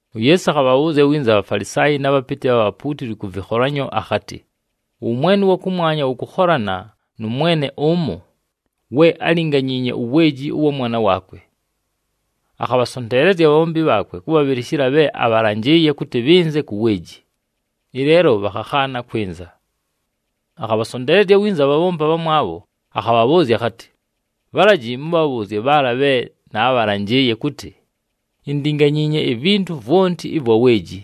UYeesu akhabhabhʉʉzya winza aBhafalisaayi na bhapɨtɨ bha bhapuutili kʉ vɨkholanyo akhatɨ, “Ʉwʉmwene ʉwa kʉmwanya wʉkʉkholana nʉ mwene ʉmo we álinganyiinye uweeji ʉwa mwana waakwe. Akhabhasonteelezya abhabhombi bhaakwe kʉbhabhɨlɨshɨla bhe abhalanjɨɨye kʉtɨ bhɨnze ku weeji, ɨleelo bhakhakhaana kwɨnza. “Akhabhasonteelezya winza abhabhombi abhamwabho, akhabhabhʉʉzya akhatɨ, ‘Bhalaji mʉbhabhʉʉzye bhaala bhe naabhalanjɨɨye kʉtɨ, “Indinganyiinye ivintu vwonti ɨvwa weeji.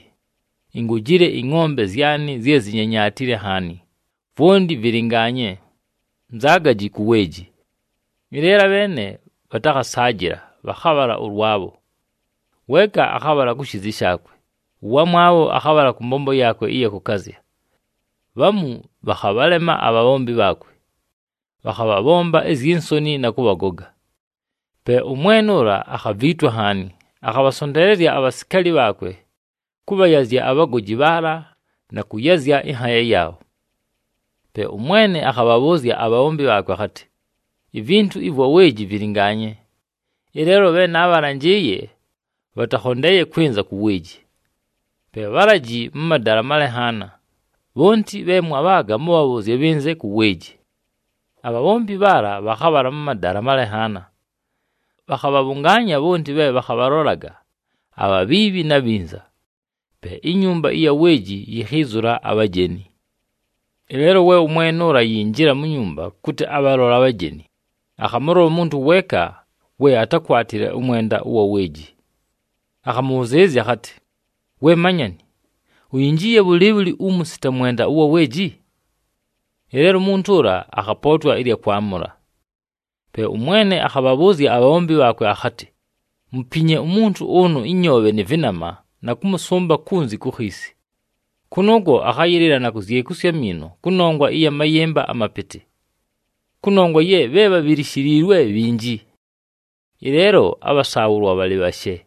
Ingojile ɨngʼombe zyanɨ zye zinyanyatile nhaani, vwonti vɨlɨngaanye. Nzaagaji ku weeji!” ’ Ɨleelo abheene bhatakhasaajɨla bhakhabhala ʉlwabho. Weeka akhabhala ku shiizi shaakwe, ʉwamwabho akhabhala kʉ mbombo yaakwe ɨya kʉkazya. Bhamu bhakhabhalema abhabhombi bhaakwe, bhakhabhabhomba izyi nsoni na kʉbhagoga. Pe ʉmwene ʉla akhaviitwa nhaani, akhabhasonteelezya abhasikaali bhaakwe kʉbhayazya abhagoji bhaala na kʉyazya ɨnhaaya yaabho. Pe ʉmwene akhabhabhʉʉzya abhabhombi bhaakwe akhatɨ, ‘Ivintu ɨvwa weeji vɨlɨngaanye, ɨleelo bhe naabhalanjɨɨye bhataakhondeeye kwɨnza ku weeji. Pe bhalaji mʉ madala amalenhaana, bhonti bhe mwabhaaga mʉbhabhʉʉzye bhɨnze ku weeji.’ Abhabhombi bhaala bhakhabhala mʉ madala amalenhaana. Bhakhabhabhʉngaanya bhonti bhe bhakhabhalolaga, abhabhiibhi na bhinza. Pe inyumba ɨya weeji yikhiizula abhajeni. “Ɨleelo we ʉmwene ʉla ayinjila mu nyumba kʉtɨ abhalole abhajeni, akhamʉlola umuntu weeka we atákwatile ʉmwenda ʉwa weeji. Akhamʉbhʉzɨɨlɨzya akhatɨ, ‘We manyani, uyinjiiye bhʉlɨɨbhʉlɨ umu sita mwenda ʉwa weeji?’ Ɨleelo umuntu ʉla akhapootwa ɨlya kwamʉla. Pe ʉmwene akhabhabhʉʉzya abhabhombi bhaakwe akhatɨ, ‘Mupinye umuntu ʉnʉ ɨnyoobhe nɨ vɨnama na kʉmʉsʉmba kunzi ku khiisi. Kʉnʉʉkwo akhayɨlɨla na kuzyekusya amiino kʉnongwa ya mayɨmba amapɨtɨ.’ Kʉnongwa ye bhe bhabhilishiliilwe bhinji, ɨleelo abhasaabhʉlwa bhalɨ bhashe.”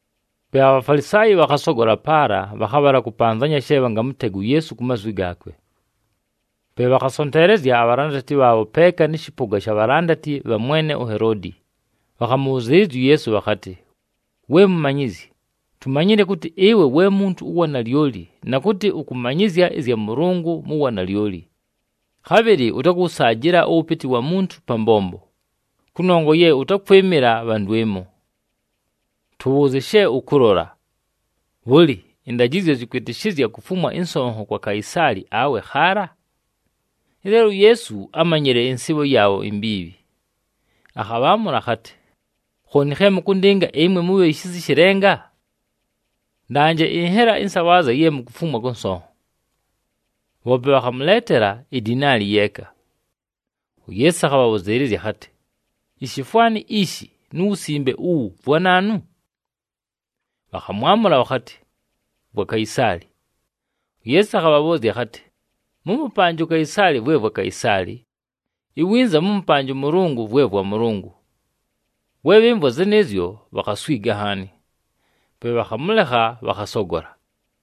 Pe aBhafalisaayi bhakhasogola paala, bhakhabhala kʉpanzanya she bhangamʉtega uYeesu ku mazwi gaakwe. Pe bhakhasonteelezya abhalandati bhaabho peeka nɨ shɨpʉga sha bhalandati bha mwene uHeloodi, bhakhamʉbhʉzɨɨlɨzya uYeesu bhakhatɨ, “We Mumanyizyi, tumanyile kʉtɨ ɨwe we muntu ʉwa nalyoli na kʉtɨ ʉkʉmanyɨzya ɨzya Mʉlʉngʉ mu wanalyoli. Khabhɨlɨ ʉtakʉwʉsaajɨla ʉwʉpɨtɨ wa muntu pa mbombo, kʉnongwa ye ʉtakwɨmɨla bha ndwɨmo. Tʉbhʉʉzye she ʉkʉlola. Bhʉlɨ, ɨndajɨzyo zɨkwɨtɨshɨzya kufumwa ɨnsonho kwa Kaisaali awe khaala?” Ɨleelo uYeesu ámanyile ɨnsɨɨbho yaabho imbiibhi, akhabhaamʉla akhatɨ, “Khooni khe mʉkʉndɨnga, ɨmwe mubhi shisa ɨshɨ lenga? Ndanje ɨnhela ɨnsabhaazya ye mukufumwa kʉ nsonho.” Bhoope bhakhamʉleetela idinaali yeeka. UYeesu akhabhabhʉzɨɨlɨzya akhatɨ, “Ishifwani ishi nu wusimbe uwu vwa naanu?” Bhakhamwamʉla bhakhatɨ, “Vwa Kaisaali.” UYeesu akhabhabhʉʉzya akhatɨ, “Mʉmʉpanje uKaisaali vwe vwa Kaisaali, iwinza mʉmʉpanje ʉMʉlʉngʉ vwe vwa Mʉlʉngʉ.” We bhɨmvwa zɨnɨɨzyo, bhakhaswiga nhaani. Pe bhakhamʉlekha, bhakhasogola.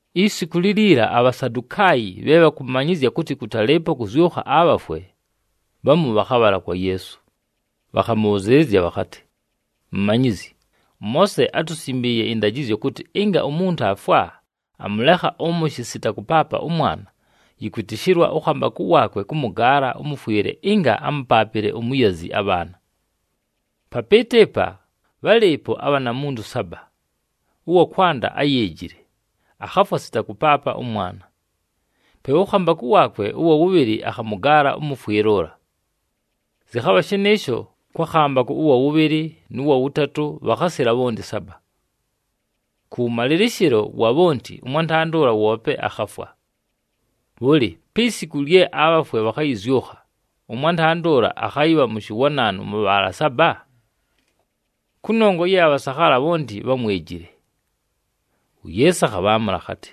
Isiku liliila, aBhasadukaayi bhe bhakʉmanyɨzya kʉtɨ kʉtalɨɨpo kʉzyʉkha abhafwe, bhamu bhakhabhala kwa Yeesu. Bhakhamʉbhʉzɨɨlɨzya bhakhatɨ, “Mumanyizyi, ʉMoose átusimbiiye ɨndajɨzyo kʉtɨ ɨnga umuntu aafwa, amʉlekha ʉmʉshɨ sita kʉpaapa ʉmwana, yɨkwɨtɨshɨlwa ʉkhambakʉ waakwe kʉmʉgaala ʉmʉfwɨle ɨnga amʉpaapɨle umuyazi abhaana. Papɨɨtʉ ɨpa, bhálɨɨpo abhanamuntu saba. Ʉwa kwanda áyeejile, akhafwa sita kʉpaapa ʉmwana. Pe ʉkhambakʉ waakwe ʉwa wʉbhɨlɨ akhamʉgaala ʉmʉfwɨle ʉla. Zɨkhabha shɨnɨɨsho kwa khambakʉ ʉwa wʉbhɨlɨ, nʉ wa wʉtatʉ, bhakhasila bhonti saba. Kʉwʉmalɨlɨshɨlo wa bhonti, ʉmwantanda ʉla woope akhafwa. Bhʉlɨ, pi siku lye abhafwe bhakhayɨzyʉkha, ʉmwantanda ʉla akhayɨbha mʉshɨ wa naanu mʉ bhaala saba? Kʉnongwa ye abhasakhaala bhonti bhámwejile!” UYeesu akhabhaamʉla akhatɨ,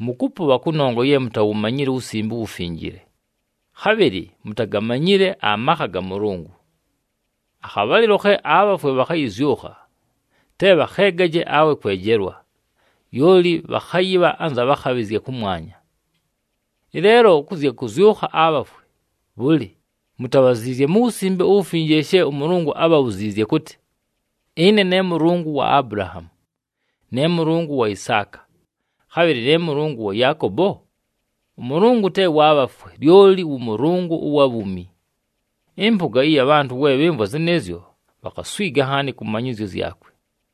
“Mʉkʉpʉbha kʉnongwa ye mutawumanyile uWusimbe uWufinjile, khabhɨlɨ mutagamanyile amakha ga Mʉlʉngʉ. Akhabhalɨlo khe abhafwe bhakhayɨzyʉkha, te bhakheegaje awe kwejelwa, lyoli bhakhayɨbha anza bhakhabhɨzya kʉmwanya. Ɨleelo kʉ zya kʉzyʉkha abhafwe, bhʉlɨ, mutabhaziizye mu Wusimbe uWufinjile she ʉMʉlʉngʉ ábhabhuziizye kʉtɨ, ‘Ɨne ne Mʉlʉngʉ wa Abulahaamu, ne Mʉlʉngʉ wa Isaaka, khabhɨlɨ ne Mʉlʉngʉ wa Yaakobo’? ɄMʉlʉngʉ te wa bhafwe, lyoli wʉ Mʉlʉngʉ ʉwa bhuumi!” Ɨmpʉga ɨya bhantʉ we bhɨmvwa zɨnɨɨzyo, bhakhaswiga nhaani kʉ manyɨzyo zyakwe.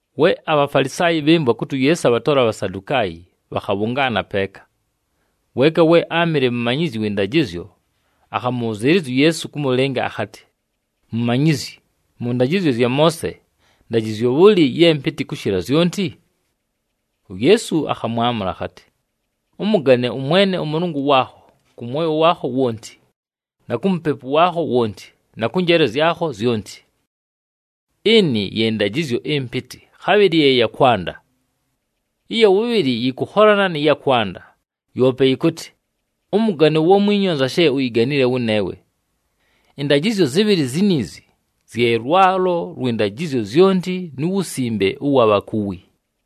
We aBhafalisaayi bhɨmvwa kʉtɨ uYeesu abhatola aBhasadukaayi, bhakhabhʉngaana peeka. Weeka we áamɨle mumanyizyi wɨ ndajɨzyo, akhamʉbhʉzɨɨlɨzya uYeesu kʉmʉlɨnga akhatɨ, “Mumanyizyi, mʉ ndajɨzyo zya Moose, ndajɨzyo bhʉlɨ ye mpɨtɨ kʉshɨla zyonti?” UYeesu akhamwamʉla akhatɨ, “‘Ʉmʉgane ʉMwene ʉMʉlʉngʉ waakho kʉ mwoyo waakho wonti, na ku mupepu waakho wonti na kʉ njeele zyakho zyonti.’ Ɨnɨ ye ndajɨzyo ɨmpɨtɨ, khabhɨlɨ ye ya kwanda. Ɨya wʉbhɨlɨ yɨkʉkholana nɨ ya kwanda, yoope yɨkʉtɨ, ‘Ʉmʉgane uwamwinyu anza she uyiganile wʉneewe.’ Ɨndajɨzyo zɨbhɨlɨ ziniizi, zye lwalo lwɨ ndajɨzyo zyonti nu wusimbe ʉwa bhakuwi.”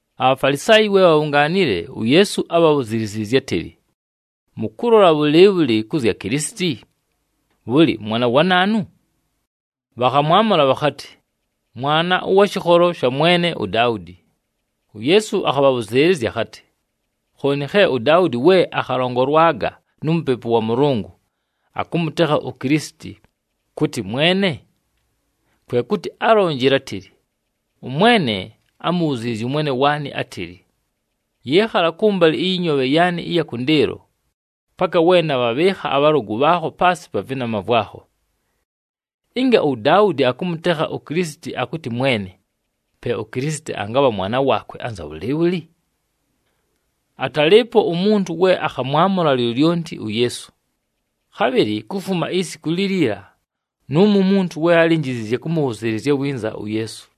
ABhafalisaayi we bhabhungaanile, uYeesu ábhabhuziliziizye átɨlɨ, “Mʉkʉlola bhʉlɨɨbhʉlɨ kʉ zya Kilisiti? Bhʉlɨ, mwana wa naanu?” Bhakhamwamʉla bhakhatɨ, “Mwana ʉwa shɨkholo sha mwene uDaudi.” UYeesu akhabhabhʉzɨɨlɨzya akhatɨ, “Khooni khe uDaudi we akhalongolwaga nu Mupepu wa Mʉlʉngʉ, akʉmʉtekha uKilisiti, kʉtɨ Mwene? Kwe kʉtɨ álonjile átɨlɨ, ‘ɄMwene ámubhuziizye ʉMwene waanɨ átɨlɨ, “Yɨɨkhala kʉmbalɨ ɨyɨ nyoobhe yaanɨ ɨya kʉndɨɨlo, paka we nabhabhɨɨkha abhalʉgʉ bhaakho paasɨ pa vɨnama vwakho.”’ “Ɨnga uDaudi akʉmʉtekha uKilisiti akʉtɨ Mwene, pe uKilisiti angabha mwana waakwe anza bhʉlɨɨbhʉlɨ?” Atalɨɨpo umuntu we akhamwamʉla lyolyonti uYeesu. Khabhɨlɨ kufuma isiku liliila nʉʉmo umuntu we álinjiziizye kʉmʉbhʉzɨɨlɨzya winza uYeesu.